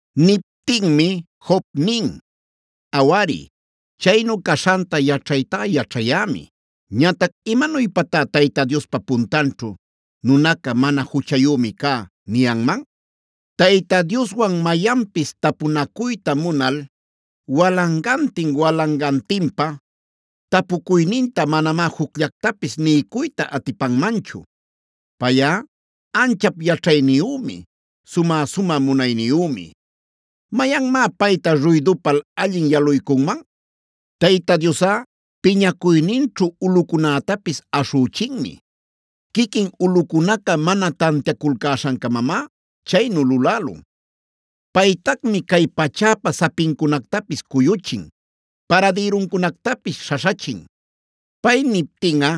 Niptinmi Job nin: “Awari, chaynu caśhanta yaćhaytá-yaćhayämi: Ñatac ¿imanuypatá Tayta Diospa puntanćhu nunaca ‘mana juchayümi’ cä niyanman? Tayta Dioswan mayanpis tapunacuyta munal walangantin-walangantinpa tapucuyninta manamá jucllactapis niycuyta atipanmanchu. Payꞌa anchap yaćhayniyümi, sumä-sumä munayniyümi. ¿Mayanmá payta ruydupal allin yaluycunman? “Tayta Diosꞌa piñacuyninćhu ulꞌucunätapis aśhüchinmi; quiquin ulꞌucunaca mana tantiaculcäśhan-camamá chaynu lulälun. Paytacmi cay pachäpa sapincunactapis cuyuchin. Paradïruncunactapis śhaśhachin. Pay niptinꞌa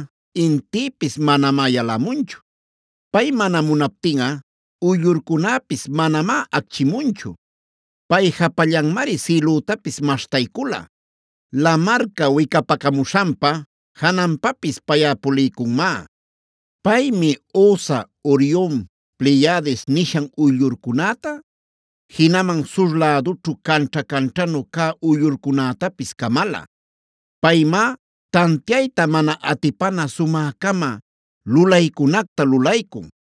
intïpis manamá yalamunchu. Pay mana munaptinꞌa uyllurcunäpis manamá acchimunchu. Pay japallanmari sïlütapis maśhtaycula. Lamarca wicapacamuśhanpa jananpapis payꞌa puliycunmá. Paymi Osa, Orion, Pleyades nishan uyllurcunäta,a jinaman sur lädućhu canćha-canćhanu cä uyllurcunätapis camala. Paymá tantiayta mana atipana sumä-cama lulaycunacta lulaycun.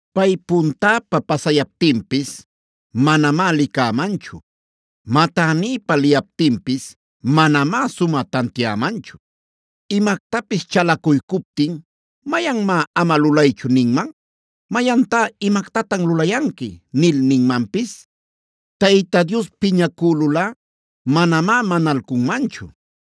Pay puntäpa pasayaptinpis manamá licämanchu. Matänïpa liyaptinpis manamá sumä tantiämanchu. Imactapis chalacuycuptin ¿mayanmá ‘ama lulaychu’ ninman? ¿Mayantá ‘imactatan lulayanqui’ nil ninmanpis? Tayta Dios piñacülulꞌa manamá manalcunmanchu.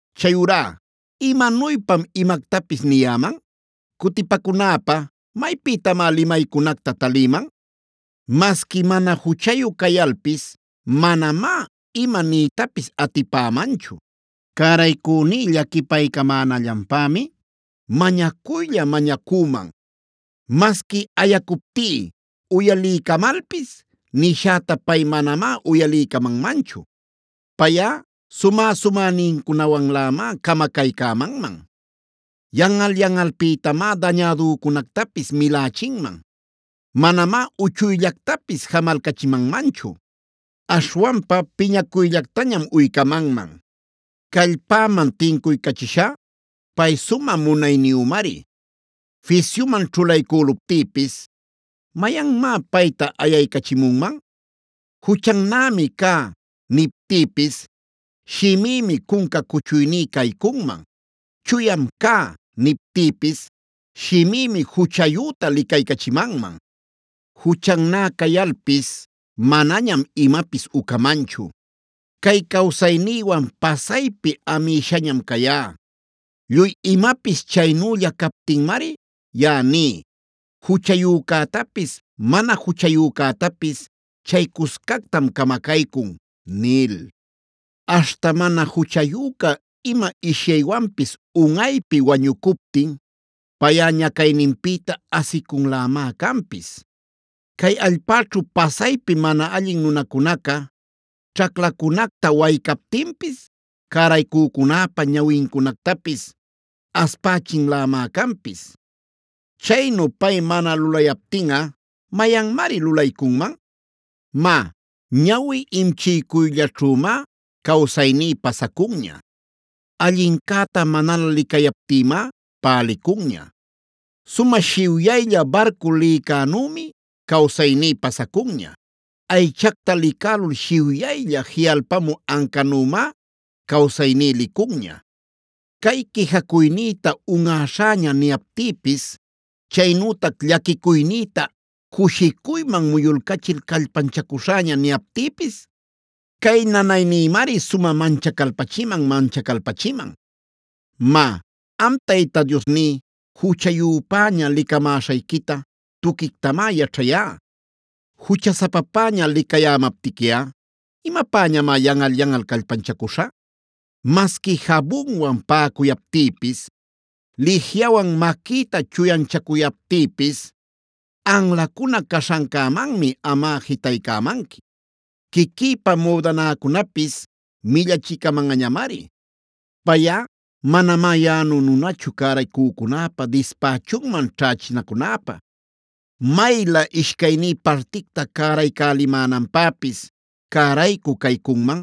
“Chayurá ¿imanuypam imactapis niyäman? ¿Cutipacunäpä maypïtamá limaycunacta talïman? Masqui mana juchayu cayalpis manamá ima niytapis atipämanchu. Cäraycüní llaquipaycamänallanpämi mañacuylla-mañacüman. Masqui ayacuptí uyaliycamalpis nishäta pay manamá uyaliycamanmanchu. Payꞌa sumä-sumänincunawanlämá camacaycämanman; yanꞌal-yanꞌalpïtamá dañädücunactapis milächinman. Manamá uchuyllactapis jamalcachimanmanchu. Aśhwanpa piñacuyllactañam uycamanman. Callpäman tincuycachishá, pay sumä munayniyümari. Fisyuman ćhulaycüluptïpis ¿mayanmá payta ayaycachimunman? ‘Juchannämi cá’ niptïpis shimïmi cunca cuchuyní caycunman. ‘Chuyam cá’ niptïpis shimïmi juchayüta licaycachimanman. “Juchannä cayalpis manañam imapis ucamanchu. Cay cawsaynïwan pasaypi amïshañam cayá. Lluy imapis chaynülla captinmari yaꞌa ní: ‘Juchayücätapis mana juchayücätapis chay cuscactam camacaycun’ nil. Aśhta mana juchayüca ima ishyaywanpis unꞌaypi wañucuptin, payꞌa ñacayninpïta asicunlämá canpis. Cay allpäćhu pasaypi mana allin nunacunaca ćhaclacunacta waycaptinpis, cäraycücunäpa ñawincunactapis aspächinlämá canpis. Chaynu pay mana lulayaptinꞌa ¿mayanmari lulaycunman? “Má, ñawi imchiycuyllaćhümá cawsayní pasacunña; allincäta manalä licayaptïmá pälicunña. Sumä shiwyaylla barcu lïcunänümi cawsayní pasacunña. Aychacta licälul shiwyaylla jiꞌalpamü ancanümá cawsayní licunña. Cay quijacuynïta unꞌäśhäña niyaptïpis, chaynütac llaquicuynïta cushicuyman muyulcachil callpanchacuśhäña niyaptïpis, cay nanaynïmari sumä manchacalpachiman-manchacalpachiman. “Má, am Tayta Diosní, juchayüpäña licamäśhayquita tuquictamá yaćhayá. Juchasapapäña licayämaptiquiꞌa ¿imapäñamá yanꞌal-yanꞌal callpanchacuśha? Masqui jabunwan paꞌacuyaptïpis, lijiyawan maquïta chuyanchacuyaptïpis, anlacuna caśhancämanmi amꞌa jitaycämanqui. Quiquïpa müdanäcunapis millachicamanꞌañamari. “Payꞌa manamá yaꞌanu nunachu cäraycücunäpä dispächunman ćhächinacunäpä. Maylä ishcayní particta cäraycälimänanpäpis cäraycü caycunman,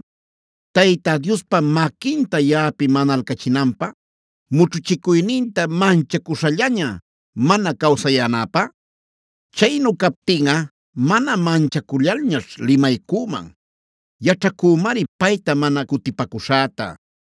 Tayta Diospa maquinta yaꞌapi manalcachinanpä, mućhuchicuyninta manchacuśhallaña mana cawsayänäpä. Chaynu captinꞌa mana manchacullalñaćh limaycüman. Yaćhacümari payta mana cutipacuśhäta.